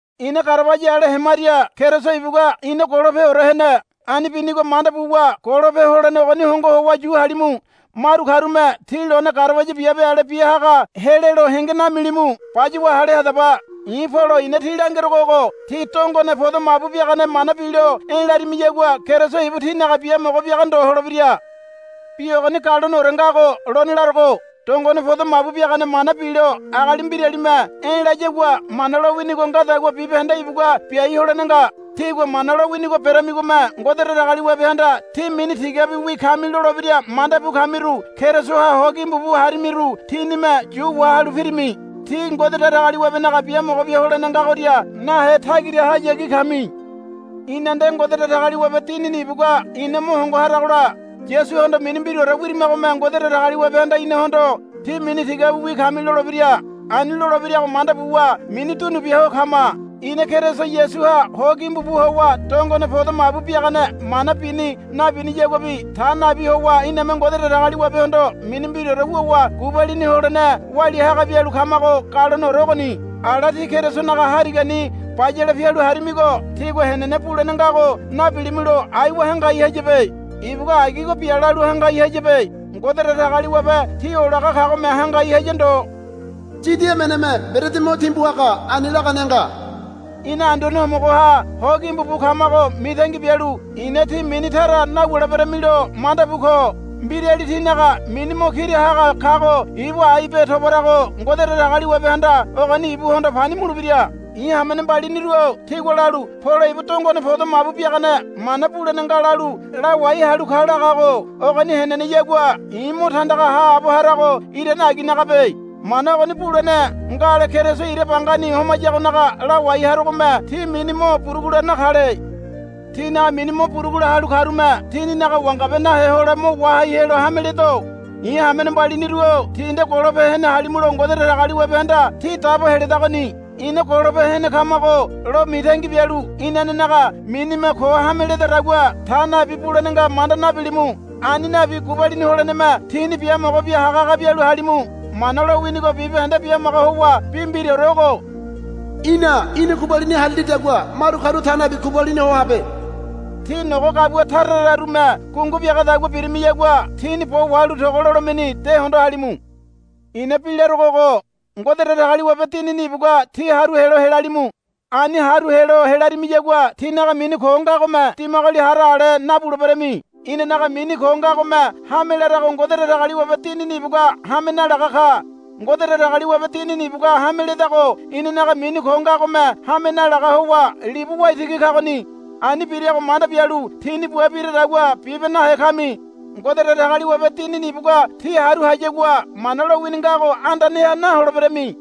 Ina garabaya ale hemaria Keriso ibugua ina golopeore hene. Ani binigo manda buwa golope holene ogoni hongo howa yu halimu. Maru karume tí lone garabaya biabe ale bia haga helelo henge namilimu. Bayuwa hale hadaba. I̱ Polo i̱na tí langerogo ogo. Tí dongone podo mabu biagane mana bilo e̱ larimiyagua Keriso ibu tínaga biamogo biaga ndo holebira. Bi ogoni galoneore ngago lone larogo. Dongone podo mabu biagane mana bilo agali mbiralime e̱ layagua Mana lowinigo ngadagua bibahende ibugua biai holene nga. Tígua Mana lowinigo beramigome Ngode Datagaliwabehanda, Tí mini tigabiwi kami, lolebira manda bu kamiru Kerisoha ho gimbu bu harimiru tínime yu wahalu pirimi. Tí Ngode Datagaliwabenaga biamogo bia holene ngagoria nahe tagirahayagi kami. Ina nde Ngode Datagaliwabe Dinini ibugua ina mo hongo haragola Yasuhondo mini mbiraore wirimagome Ngode Datagaliwabehanda inahondo. Tí mini tigabiwi kami, lolebira. Ani lolebirago manda buwa mini dunu bia ho kama. Ina Keriso Yasuha ho gimbu bu howa dongone podo mabu biagane mana bini nabiniyaguabi ta nabi howa iname Ngode Datagaliwabehondo mini mbiraore wuwa gubalini holene walia haga bialu kamago galoneore ogoni. Ala tí Kerisonaga harigani bayale pialu harimigo tígua henene bulene ngago nabilimulo aiwa hangai hayabe. Ibugua agigo bia lalu hangai hayabe. Ngode Datagaliwabe tí olaga kagome hangai haya ndo. Yidi emeneme mberedi mo timbu haga ani lagane nga. Ina Anduane Homogoha ho gimbu bu kamago mitangi bialu i̱na tí mini tara nawuleberamilo manda bu ko. Mbirali tínaga mini mo kira haga kago ibu aibe tobarago Ngode Datagaliwabehanda ogoni ibuhondo pani mulebira. I̱ hamene mbaliniru-o tígua lalu, Polo ibu dongone podo mabu biagane mana bulene nga lalu lawai halu ka, lagago ogoni heneneyagua i̱ mo tandaga haabo harago irane aginagabe. Mana ogoni bulene ngale Keriso ira bangani homayagonaga lawai harogome tí mini mo burugula nakale. Tínaga mini mo burugula halu karume tininaga wangabe nahe hole mo wahai helo hame ledo. I̱ hamene mbaliniru-o tí nde golope hene halimulo Ngode Datagaliwabehanda tí dabo heledagoni. Ina golope hene kamago lo mitangi bialu inanenaga minime ko hame ledadagua ta nabi bulene nga manda nabilimu. Ani nabi gubalini holeneme tíni biamogo bia haga haga bialu halimu. Mana lowinigo bibahende bimaga howa bi mbiraore ogo, Í̠na í̠ni gubalini harilidagua maru karu ta nabi gubalini ho habe. Tí nogo gabua tara tararume gungu biagadagua birimiyagua tíni bo wahalu togo lolemeni de hondo halimu. I̱na bi larogo ogo. Ngode Datagaliwabe Dinini ibugua tí haru helo helalimu. Ani haru helo helarimiyagua tínaga mini ko ngagome dimagoli hara ale nabuleberami. Inanaga mini ko ngagome hame larago Ngode Datagaliwabe Dinini ibugua hame nalaga ka. Ngode Datagaliwabe Dinini ibugua hame ledago inanaga mini ko ngagome hame nalaga howa libu waitigi kagoni. Ani birago manda bialu tíni bua biradagua bibe nahe kami. Ngode Datagaliwabe Dinini ibugua tí haru hayagua Mana lowini ngago andaneha naholeberami.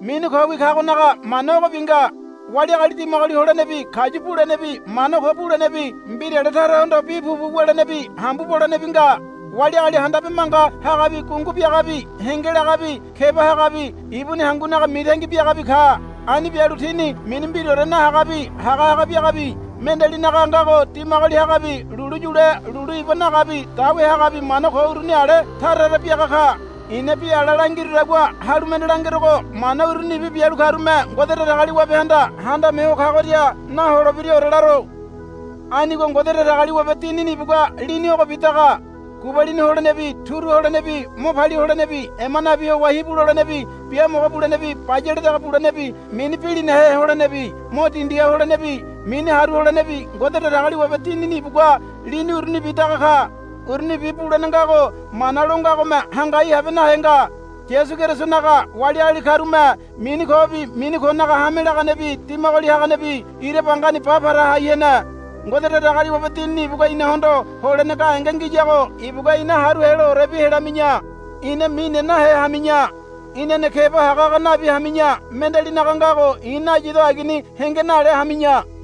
Mini kowi kagonaga mana ogobi nga. Wali agali dimagoli holenebi kayu bulenebi mana ko bulenebi mbirale tarahondo bi pupu wulenebi hambu bolenebi nga. Wali agali handabe manga hagabi gungu biagabi henge lagabi keba hagabi ibuni hangunaga mitangi biagabi ka. Ani bialu tini mini mbiraore nahagabi haga haga biagabi mendealinaga ngago dimagoli hagabi lulu yule lulu iba nagabi dawe hagabi mana ko uruni ale tara tara biaga ka. I̱na bi ala langirudagua halu mende langerogo mana urunibi bialu karume Ngode Datagaliwabehanda Handame Ho Kagoria naholebiraore laro. Anigo Ngode Datagaliwabe Dinini ibugua lini ogobi daga. Gubalini holenebi turu holenebi mo palia holenebi ema nabi howa hibu lolenebi biamogo bulenebi bayale dege bulenebi mini bilinahe holenebi mo dindiha holenebi mini haru holenebi Ngode Datagaliwabe Dinini ibugua lini urunibi daga ka. Urunibi bulene ngago mana lo ngagome hangai habe nahe nga. Yasu Kerisonaga wali agali karume mini kobi mini konaga hame laganebi dimagoli haganebi ira bangani ba para hai hene. Ngode Datagaliwabe Dinini ibugua inahondo holene gahenge ngiyago ibugua ina haru heloorebi helami̱ya. Ina mine nahe hami̱ya. Inane keba haga haga nabi hami̱ya. Mendealinaga ngago i̱ nayido agini henge nale hami̱ya.